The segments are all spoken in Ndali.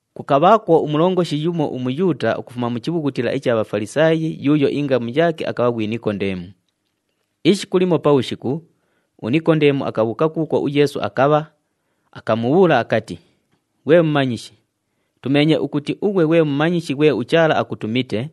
Kukabhaakwo umulongoshi yumo uMuyuuta ukufuma mu chibhughutila icha Bhafalisaayi yuuyo ingamu yaake akabha ghwi Nikondeemu. Ishiku limo pabhushiku, uNikondeemu akabhuuka kuukwo uYeesu akabha, akamubhuula akati, “Ghwe Mumanyishi, tumeenye ukuti ughwe ghwe mumanyishi ghwe uChaala akutumite,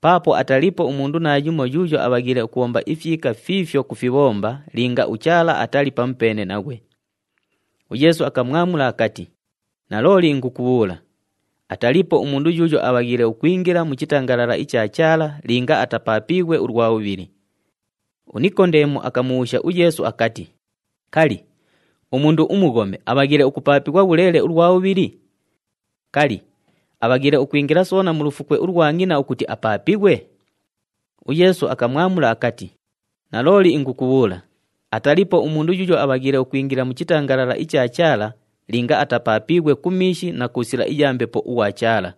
paapo ataliipo umundu naayumo yuuyo abhaghiile ukubhomba ifyika fiifyo kufibhomba linga uChaala atali pamupeene naghwe.” UYeesu akamwamula akati, “Nalooli ingukubhuula, ataliipo umundu yuuyo abhaghiile ukwingila mu chitangalala icha Chaala linga atapaapiighwe ulwa bhubhili.” UNikondeemu akamubhuusha uYeesu akati, “Kali, umundu umughome abhaghiile ukupaapighwa bhuleele ulwa bhubhili? Kali, abhaghiile ukwingila soona mu lufukwe ulwa ngʼina ukuti apaapighwe?” UYeesu akamwamula akati, “Nalooli ingukubhuula, ataliipo umundu yuuyo abhaghiile ukwingila mu chitangalala icha Chaala linga atapaapiighwe ku miishi na ku sila iya Mbepo ughwa Chaala.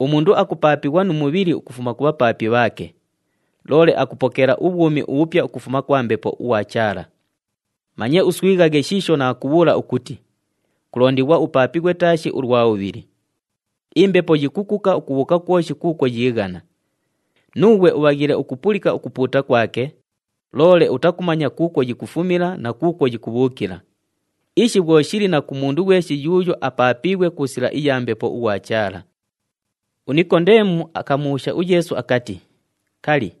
Umundu akupaapighwa nu mubhili ukufuma ku bhapaapi bhaake, loole akupokeela ubhwumi ubhupya ukufuma kwa Mbepo ughwa Chaala. Manye uswighaghe shiisho naakubhuula ukuti, ‘Kulondighwa upaapighwe taashi ulwa bhubhili.’ Imbepo yikukuka ukubhuuka kwoshi kuukwo yiighana. Nuughwe ubhaghiile ukupulika ukupuuta kwake, loole utakumanya kuukwo yikufumila na kuukwo yikubhuukila. Ishi bhwo shili na ku mundu ghweshi yuuyo apaapiighwe ku sila iya Mbepo ughwa Chaala.” UNikondeemu akamubhuusha uYeesu akati, “Kali,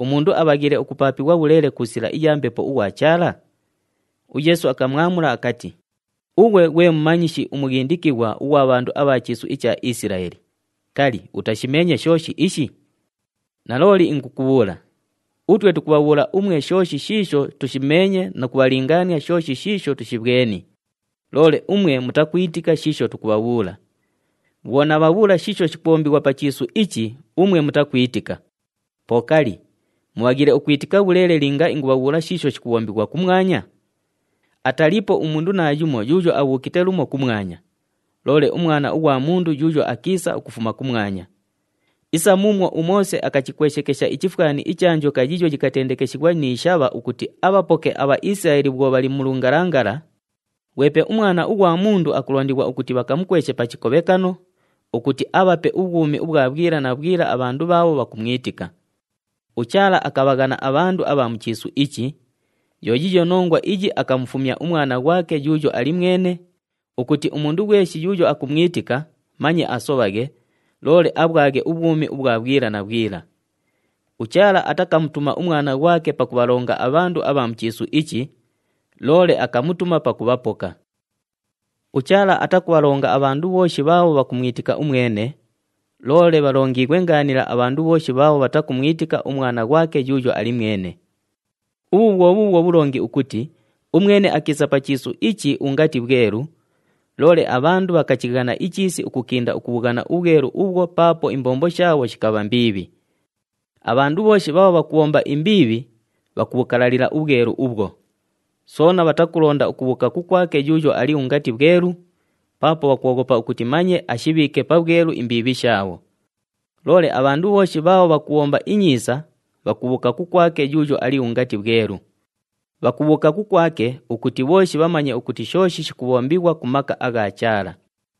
umundu abhaghiile ukupaapighwa bhuleele ku sila iya Mbepo ughwa Chaala?” UYeesu akamwamula akati, “Ughwe ghwe mumanyishi umughindikighwa ughwa bhandu abha chiisu icha Isilaeli, kali, utashimeenye shooshi ishi? Nalooli ingukubhuula, utwe tukubhabhuula umwe shooshi shiisho tushimeenye nu kubhalingaania shooshi shiisho tushibhweni, loole umwe mutakwitika shiisho tukubhabhuula. Bhwo naabhabhuula shiisho shikubhombighwa pa chiisu ichi umwe mutakwitika, po kali, mubhaghiile ukwitika bhuleele linga ingubhabhuula shiisho shikubhombighwa kumwanya? Ataliipo umundu naayumo yuuyo abhuukite lumo kumwanya, loole uMwana ughwa Mundu yuuyo akiisa ukufuma kumwanya. Isa muumwo uMoose akachikweshekesha ichifwani icha njoka yiiyo yikatendekeshighwa ni shabha ukuti abhapoke aBhaisilaeli bhwo bhali mu lungalangala, ghwepe uMwana ughwa Mundu akulondighwa ukuti bhakamukweshe pa chikobhekano, ukuti abhape ubhwumi ubhwa bhwila na bhwila abhandu bhaabho bhakumwitika. UChaala akabhaghana abhandu abha mu chiisu ichi, yo yiiyo nongwa iyi akamufumya uMwana ghwake yuuyo ali mwene, ukuti umundu ghweshi yuuyo akumwitika manye asobhaghe, loole abhwaghe ubhwumi ubhwa bhwila na bhwila. UChaala atakamutuma uMwana ghwake pakubhalonga abhandu abha mu chiisu ichi, loole akamutuma pakubhapoka. “UChaala atakubhalonga abhandu bhooshi bhaabho bhakumwitika umwene, loole bhalongiighwe ngaanila abhandu bhooshi bhaabho bhatakumwitika uMwana ghwake yuuyo ali mwene. Ubhu bhwo bhuubhwo bhulongi ukuti umwene akiisa pa chiisu ichi ungati bhwelu, loole abhandu bhakachighana ichiisi ukukinda ukubhughana ubhwelu ubhwo paapo imbombo shaabho shikabha mbiibhi. Abhandu bhooshi bhaabho bhakubhomba imbiibhi bhakubhukalalila ubhwelu ubhwo, soona bhatakulonda ukubhuuka kukwake yuuyo ali ungati bhwelu, paapo bhakwoghopa ukuti manye ashibhiike pabhwelu imbiibhi shaabho. Loole abhandu bhooshi bhaabho bhakubhomba inyiisa bhakubhuuka kukwake yuuyo ali ungati bhwelu. Bhakubhuuka kukwake ukuti bhooshi bhamanye ukuti shooshi shikubhombighwa ku maka agha Chaala.”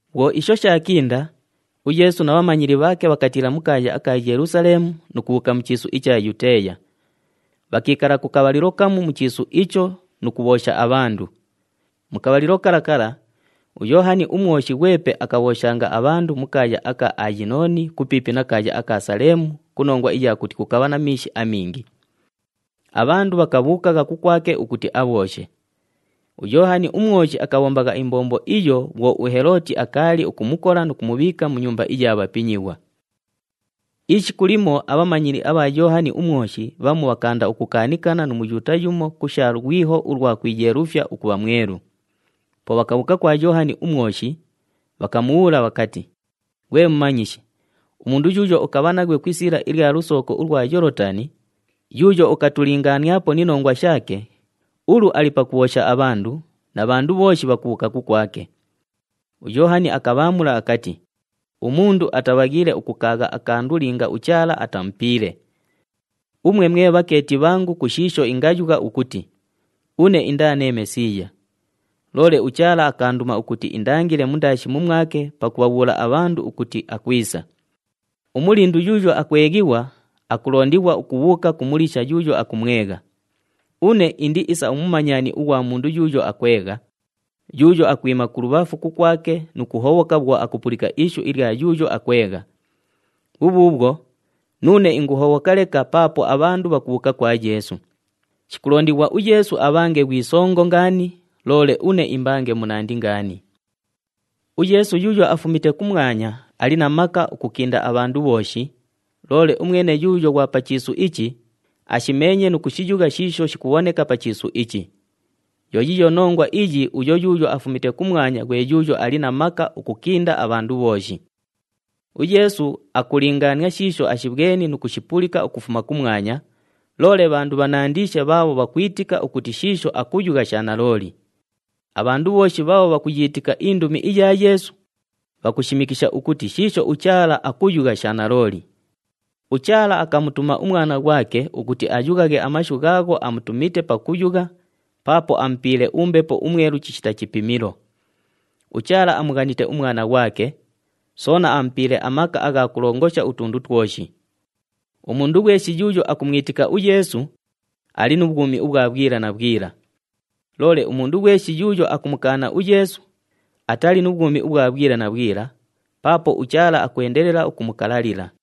Bhwo isho shaakinda, uYeesu na bhamanyili bhaake bhakatiila mu kaaya aka Yelusaleemu nu kubhuuka mu chiisu icha Yuteeya. Bhakiikala ku kabhalilo kamu mu chiisu icho nu kubhoosha abhandu. Mu kabhalilo kala kala, uYoohani uMwoshi ghwepe akabhooshanga abhandu mu kaaya aka Ayinooni kupiipi na kaaya aka Saleemu ku nongwa iya kuti kukabha na miishi amingi. Abhandu bhakabhuukagha kukwake ukuti abhooshe. UYoohani uMwoshi akabhombagha imbombo iyo bhwo uHelooti akaali ukumukola nu kumubhiika mu nyumba iya bhapinyighwa. Ishiku limo abhamanyili abha Yoohani uMwoshi bhamu bhakaanda ukukaanikana nu Muyuuta yumo ku sha lwiho ulwa kwiyeelufya ukubha mwelu. Po bhakabhuuka kwa Yoohani uMwoshi, bhakamubhuula bhakati, “Ghwe Mumanyishi, umundu yuuyo ukabha naghwe ku isiila ilya lusooko ulwa Yoolotani, yuuyo ukatulingaaniapo ni nongwa shaake, ulu ali pakubhoosha abhandu na bhandu bhooshi bhakubhuuka kukwake.” UYoohani akabhaamula akati, “Umundu atabhaghiile ukukaagha akandu linga uChaala atamupiile. Umwe mwe bhakeeti bhangu ku shiisho ingayugha ukuti, ‘Une indaa nee Mesiiya,’ loole uChaala akaanduma ukuti indangile mundaashi mumwake pakubhabhuula abhandu ukuti akwisa. Umulindu yuuyo akweghighwa, akulondighwa ukubhuuka ku muliisha yuuyo akumwegha. Une indi isa umumanyani ughwa mundu yuuyo akwegha, yuuyo akwima kulubhafu kukwake nu kuhobhoka bhwo akupulika ishu ilya yuuyo akwegha. Bhubhuubhwo, nuune inguhobhoka leka paapo abhandu bhakubhuuka kwa Yeesu. Shikulondighwa uYeesu abhange ghwi songo ngaani, loole une imbange munandi ngaani. “UYeesu yuuyo afumite kumwanya ali na maka ukukinda abhandu bhooshi, loole umwene yuuyo ghwa pa chiisu ichi, ashimeenye nu kushiyugha shiisho shikubhoneka pa chiisu ichi. Yo yiiyo nongwa iyi uyo yuuyo afumite kumwanya ghwe yuuyo ali na maka ukukinda abhandu bhooshi. UYeesu akulingaania shiisho ashibhweni nu kushipulika ukufuma kumwanya, loole bhandu bhanandiishe bhaabho bhakwitika ukuti shiisho akuyugha sha nalooli. Abhandu bhooshi bhaabho bhakuyiitika indumi iya Yeesu, bhakushimikisha ukuti shiisho uChaala akuyugha sha nalooli. UChaala akamutuma uMwana ghwake ukuti ayughaghe amashu ghaagho amutumite pakuyugha paapo amupiile uMbepo uMwelu chishita chipimilo. UChaala amughanite uMwana ghwake, soona amupiile amaka agha kulongosha utundu twoshi. Umundu ghweshi yuuyo akumwitika uYeesu, ali nu bhwumi ubhwa bhwila na bhwila, loole umundu ghweshi yuuyo akumukaana uYeesu, atali nu bhwumi ubhwa bhwila na bhwila paapo uChaala akwendelela ukumukalalila.”